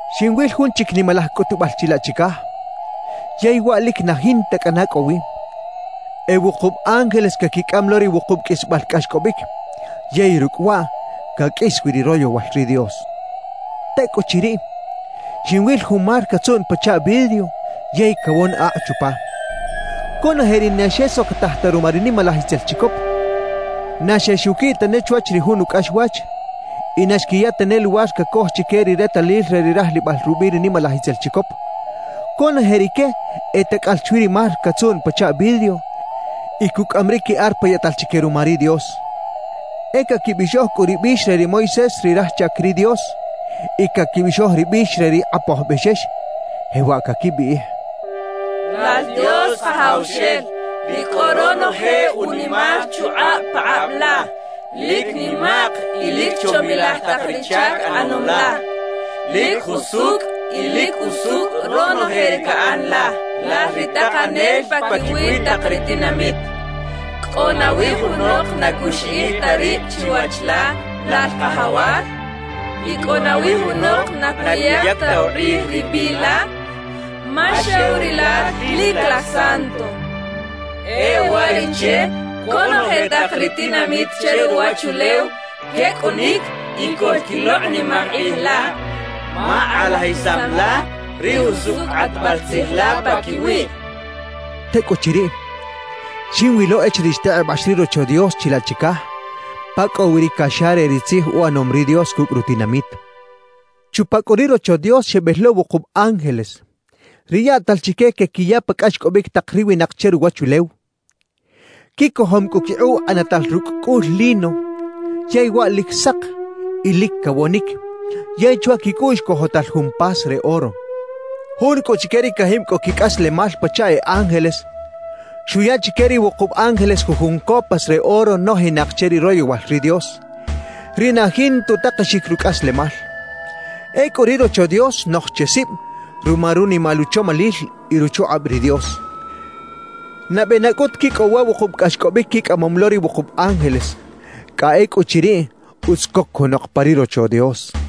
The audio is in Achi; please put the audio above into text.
Xinwil jun chic nimalaj cꞌutubal chilaꞌ chicaj yey waꞌ lic na jinta cꞌana cꞌo wi: E wukub ángeles caquicꞌam lo ri wukub qꞌuisbal cꞌaxcꞌobic; yey rucꞌ waꞌ caqꞌuis wi ri royowal ri Dios. Tecꞌuchiriꞌ, xinwil jun mar catzuꞌn pachaꞌ vidrio yey cawon akꞌ chupa. Conoje ri na xesocotaj ta ruma ri nimalaj itzel chicop, na xexuquiꞌ tane chwach ri jun ucꞌaxwach y na xquiya tane luwar cacoj chique ri retalil re ri rajlibal rubiꞌ ri nimalaj itzel chicop, conoje rique e tacꞌal chwi ri mar catzuꞌn pachaꞌ vidrio y cucꞌaꞌam ri qui arpa yaꞌtal chique ruma ri Dios. E caquibixoj cꞌu ri bix re ri Moisés ri raj chac ri Dios y caquibixoj ri bix re ri Kꞌapoj Bexex, jewaꞌ caquibiꞌij: Lal Dios Kajawxel, ri cꞌo ronoje unimal chukꞌab pakꞌab la. Lic nimaꞌk y lic chomilaj tak ri chac ꞌanom la, lic jusucꞌ y lic usucꞌ ronoje ri caꞌan la, Lal ri Takanel paquiwi tak ri tinamit. ¿Cꞌo nawi junok na cuxiꞌij ta rib chiwach la, Lal Kajawal? ¿Y cꞌo nawi junok na cuyac ta ukꞌij ri biꞌ la? Ma xew Rilal lic Lal santo. E uwariꞌche conoje tak ri tinamit che ruwachulew quecꞌunic y coꞌlquilokꞌnimaj kꞌij la, ma kꞌalajisam la ri jusucꞌ kꞌatbal tzij la paquiwiꞌ quechaꞌ. Tecꞌuchiriꞌ, xinwilo echiriꞌ xtekꞌebax ri Rocho Dios chilaꞌ chicaj pa cꞌo wi ri caxa re ri tzij uꞌanom ri Dios cucꞌ rutinamit. Chupa cꞌu ri Rocho Dios xebel lo wukub ángeles, ri yaꞌtal chique quequiya pa cꞌaxcꞌobic tak ri winak che ruwachulew. Quicojom cꞌu quikꞌuꞌ ꞌanatal rucꞌ cꞌul lino yey waꞌ lic sak y lic cawonic, yey chwa quicꞌuꞌx cojotal jun pas re oro. Jun cꞌu chique ri cajib cꞌo quicꞌaslemal pachaꞌ e ángeles xuya chique ri wukub ángeles jujun copas re oro nojinak che ri royowal ri Dios, ri na jinta utakexic rucꞌaslemal. Ecꞌu ri Rocho Dios xnoj che sib ruma runimal uchomalil y ruchukꞌab ri Dios. Nabe na cꞌut quicꞌow wa wukub cꞌaxcꞌobic quicꞌamom lo ri wukub ángeles, cꞌa ecꞌuchiriꞌ utz coc junok pa ri Rocho Dios.